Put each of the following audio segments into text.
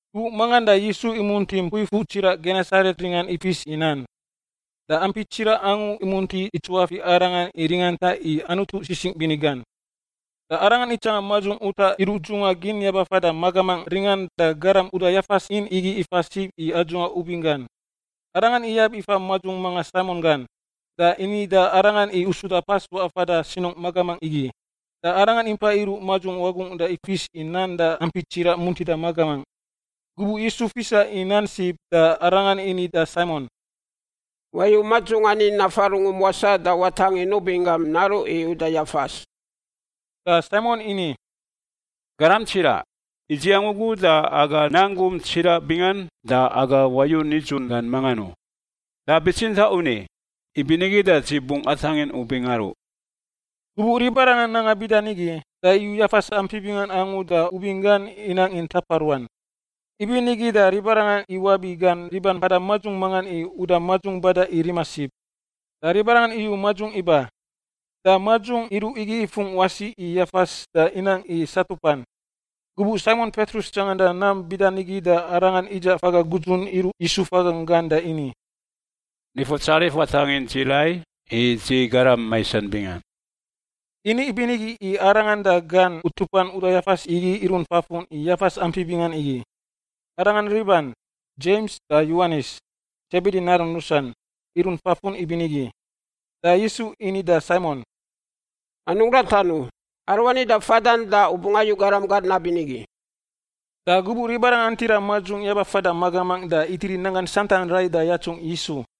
Gubuꞌ mangan da Yisu imunti mpui fuꞌ tsiraꞌ Genesaret ringan ifis i nan, da ampi tsiraꞌ angu imunti itsuafiꞌ Arangan i ringanta i Anutu sisingꞌ bini gan. Da Arangan itsanga madzung utaꞌ iruꞌ dzungꞌa gin yaba fada magamangꞌ ringan da garam uda yafas in igi ifa sib i adzuꞌa ubing gan. Arangan iyab ifa madzung manga Saimon gan, da ini da arangan i usuda pas waꞌa fada sinungꞌ magamangꞌ igi. Da Arangan impa iruꞌ madzung wagungꞌ da ifis i nan da ampi tsiraꞌ muntida magamangꞌ. Gubuꞌ Yisu fisa i nan sib da Arangan ini da Saimon, “Wayu madzung ani nafa rungum wasaꞌ da watangin ubing gam naruꞌ i uda yafas.” Da Saimon ini, “Garam tsiraꞌ, idziang ugu da aga nang gum tsiraꞌ bingan da aga wayu nidzun gan mangan u. Da bitsintaꞌ u ni, ibinigi da dzi bungꞌ atangin ubing aruꞌ.” Gubuꞌ ribarangan nanga bida nigi, da iyu yafas ampi bingan angu da ubing gan inang i ntapa ruan. Ibinigi da ribarangan iwabi gan riban mpada madzung mangan i uda madzung bada i rima sib. Da ribarangan iyu madzung iba, da madzung iruꞌ igi ifungꞌ wasi i yafas da inang i satupan. Gubuꞌ Saimon Petrus tsanganda nam bida nigi da arangan idzaꞌ faga gudzun iruꞌ Yisu fagan da ini, “Nifutsarif, watangin dzi rai, i dzi garam maisan bingan.” Ini ibinigi i arangan da gan utupan uda yafas igi irunt fafun i yafas ampi bingan igi. Arangan riban Dzems da Yowanis, Sebedi narun rusan, irunt fafun ibinigi. Da Yisu ini da Saimon, “Anungꞌ ratan u. Aruani da fadan da u bungꞌ ayu garam gar nabinigi.” Da gubuꞌ ribarangan antira madzung yaba fada magamangꞌ da itiri nanggan santan rai da yatsungꞌ Yisu.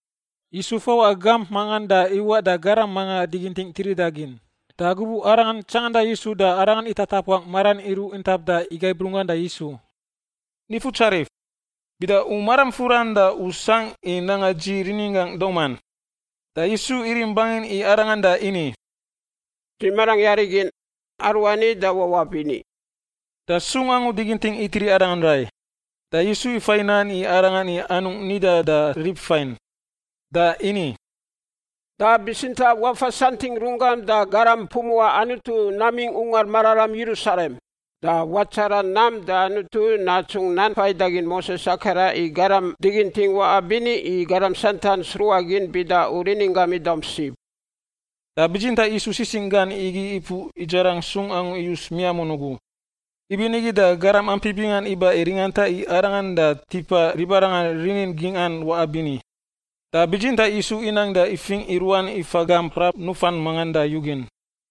Yisu fawaꞌa gamp mangan da iwaꞌ da garam manga diginting tirida gin. Da gubuꞌ arangan tsanganda Yisu da arangan itatapuangꞌ maran iruꞌ intap da igaib runggan da Yisu, “Nifutsarif, bida u maram furan da u sangꞌ i nanga dzi rininggangꞌ dauman.” Da Yisu irim bangin i arangan da ini, “Dzi marangꞌ yari gin. Aruani da wawaꞌ bini.” Da sung angu diginting itiri arangan rai. Da Yisu ifai nan i arangan i anungꞌ nidan da rib fain. Da ini, “Da bitsintaꞌ wafasantingꞌ runggam da garam pumuꞌa Anutu namingꞌ Ungar Mararam Yerusalem. Da watsara nam da Anutu natsungꞌ nan faidagin Moses akaran i garam diginting waꞌa bini, i garam santan sruꞌa gin bida u rininggam idaum sib.” Da bitsintaꞌ Yisu sisingꞌ gan igi ipuꞌ idzarang sung angu iyus miamun ugu, ibinigi da garam ampi bingan iba i ringanta i Arangan da tipa ribarangan rinin gingꞌan waꞌa bini. Da bitsintaꞌ Yisu inang da ifingꞌ iruan ifa gamp frap nufan mangan da yugin.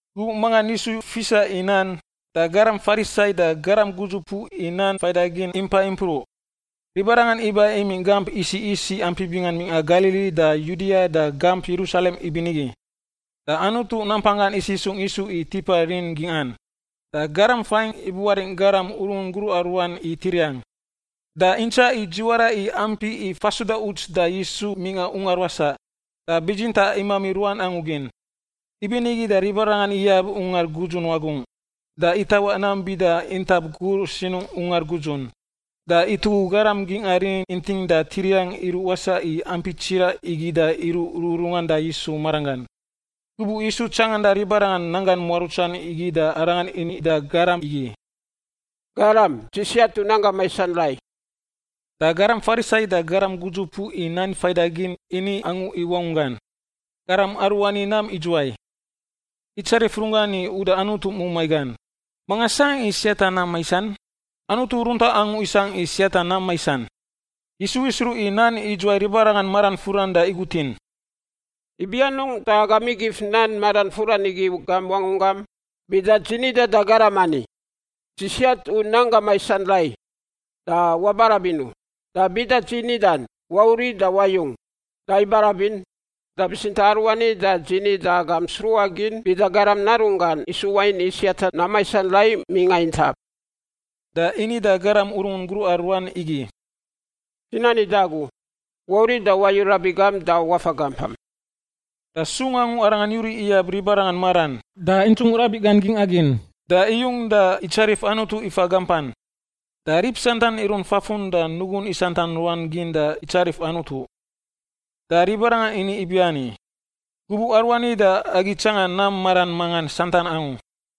Gubuꞌ mangan Yisu fisa i nan, da garam Farisai da garam gudzupuꞌ i nan faidagin impai impruꞌ. Ribarangan iba imingꞌ gamp isiꞌ isiꞌ ampi bingan mingꞌa Galili da Yudia da gamp Yerusalem ibinigi. Da Anutu nampanggan isisungꞌ Yisu i tipa rinin gingꞌan. Da garam faingꞌ ibuaringꞌ garam urungun gruꞌa ruan i tiriang. Da intsaꞌ i dziwara i ampi i fasuda uts da Yisu mingꞌa ungar wasaꞌ, da bitsintaꞌ imami ruan angu gin. Ibinigi da ribarangan iyab ungar gudzun wagungꞌ, da itawaꞌ nam bida intap gur sinungꞌ ungar gudzun. Da itugu garam gingꞌa rinin inting da tiriang iruꞌ wasaꞌ i ampi tsiraꞌ igi da iruꞌ rururungan da Yisu maranggan. Gubuꞌ Yisu tsanganda ribarangan nanggan muarutsan igi da Arangan ini da garam igi, “Garam, dzi siat u nanggam maisan rai.” Da garam Farisai da garam gudzupuꞌ i nan faidagin ini angu i wangunggan, “Garam aruani nam idzuwai? Itsarif runggan i uda Anutu mumai gan! Manga sangꞌ i siata nam maisan? Anutu runtaꞌ angu isangꞌ i siata nam maisan.” Yisu isruꞌ i nan idzuwai ribarangan maran furan da igutin, “Ibi anungꞌ da agam igif nan maran furan igi i gam wangunggam? Bida dzi nidan da garam ani, ‘Dzi siat u nanggam maisan rai,’ da wabarabin u, da bida dzi nidan, ‘Wauriꞌ da wayung,’ da ibarabin. Da bitsintaꞌ aruani da dzi ni agam sruꞌa gin bida Garam Narunggan isu wain i siata nam maisan rai mingꞌa intap.” Da ini da garam urungun gruꞌa ruan igi, “Dzi nani da agu, wauriꞌ da wayu rabiꞌ gam da wafa gampam.” Da sung angu arangan yuriꞌ iyab ribarangan maran, da intsung rabiꞌ gan gingꞌa gin, da iyung da itsarif Anutu ifa gampan. Da rib santan irunt fafun da nugun isantan ruan gin da itsarif Anutu. Da ribarangan ini ibiani, “Gubuꞌ aruani da agi tsanga nam maran mangan santan angu.”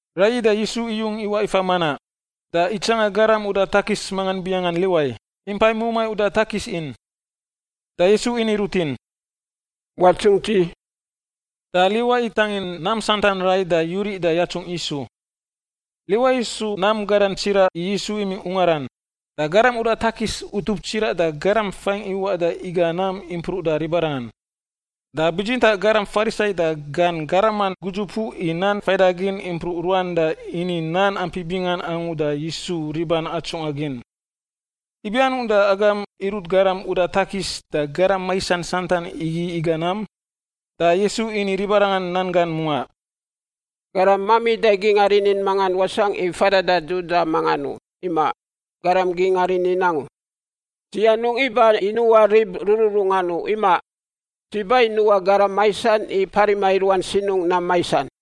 Raiyi da Yisu iyung iwaꞌ ifa manaꞌ, da itsanga garam uda takis mangan binganggan Liwai impai mumai uda takis in. Da Yisu ini rutin, “Watsungꞌ dzi.” Da Liwai itangin nam santan rai da yuriꞌ da yatsungꞌ Yisu. Liwai isu nam gadan tsiraꞌ i Yisu imingꞌ ungaran. Da garam uda takis utup tsiraꞌ da garam faingꞌ iwaꞌ da iga nam impruꞌ da ribarangan. Da bitsintaꞌ garam Farisai da gan garaman gudzupuꞌ i nan faidagin impruꞌ ruan da ini nan ampi bingan angu da Yisu riban atsungꞌa gin, “Ibi anungꞌ da agam irut garam uda takis da garam maisan santan igi iga nam?” Da Yisu ini ribarangan nan gan mungaꞌ, “Garam mamida gingꞌa rinin mangan wasangꞌ i fada da dudaꞌ mangan u, imaꞌ, garam gingꞌa rinin angu. Dzi anungꞌ iba i nuꞌa rib rururungan u, imaꞌ; dzi ba i nuꞌa garam maisan i parima i ruan sinungꞌ nam maisan.”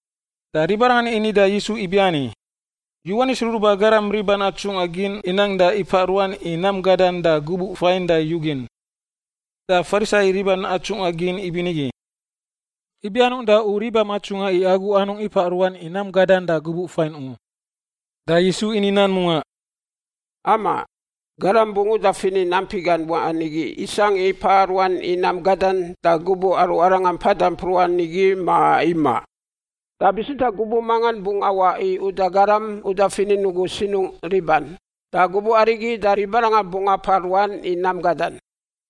Da ribarangan ini da Yisu ibiani, “Yowanis Ruruba Garam riban atsungꞌa gin inang da ipaꞌ ruan i nam gadan da gubuꞌ fain da yugin, da Farisai riban atsungꞌa gin ibinigi. Ibi anungꞌ da u ribam atsungꞌa i agu anungꞌ ipaꞌ ruan i nam gadan da gubuꞌ fain u?” Da Yisu ini nan mungaꞌ, “Amaꞌ, garam bungꞌ uda finin ampi gan waꞌan igi isangꞌ i paꞌa ruan i nam gadan da gubuꞌ aru arangan mpada mpruꞌan igi, ma imaꞌ? Da bitsintaꞌ gubuꞌ mangan bungꞌ awaꞌ i uda garam uda finin ugu sinungꞌ riban, da gubuꞌ arigi da ribarangan bungꞌ apaꞌ ruan i nam gadan.”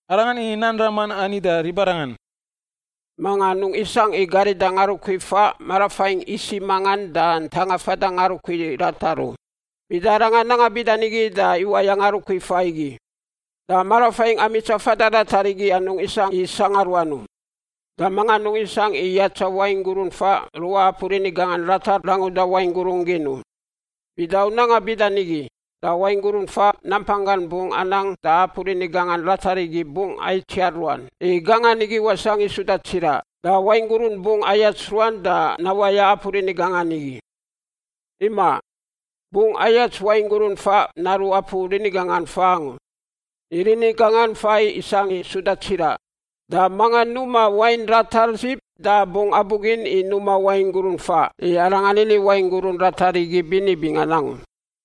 Arangan ini nan raman ani da ribarangan, “Manga anungꞌ isangꞌ i garida ngarukui faꞌ marafaingꞌ isiꞌ mangan da ntanga fada ngarukui ratar u. Bida arangan nanga bida nigi da iwaya ngarukui faꞌ igi da marafaingꞌ amitsa fada ratar igi anungꞌ isangꞌ i sangꞌa ruan u. Da manga anungꞌ isangꞌ i yatsa wain gurun faꞌ ruꞌa apu rini gangan ratar ranguda wain gurun gin u. Bida u nanga bida nigi da wain gurun faꞌ nampanggan bungꞌ anang da apu rini gangan ratar igi bungꞌ aitsiar ruan, i gangan igi wasangꞌ i suda tsiraꞌ. Da wain gurun bungꞌ ayats ruan da nawaya apu rini gangan igi. Imaꞌ, bungꞌ ayats wain gurun faꞌ naruꞌ apu rini gangan faꞌ angu, i rini gangan faꞌ isangꞌ i suda tsiraꞌ. Da manga numa wain ratar sib da bungꞌ abugin i numa wain gurun faꞌ, i arangan ini wain gurun ratar igi bini bingan angu.”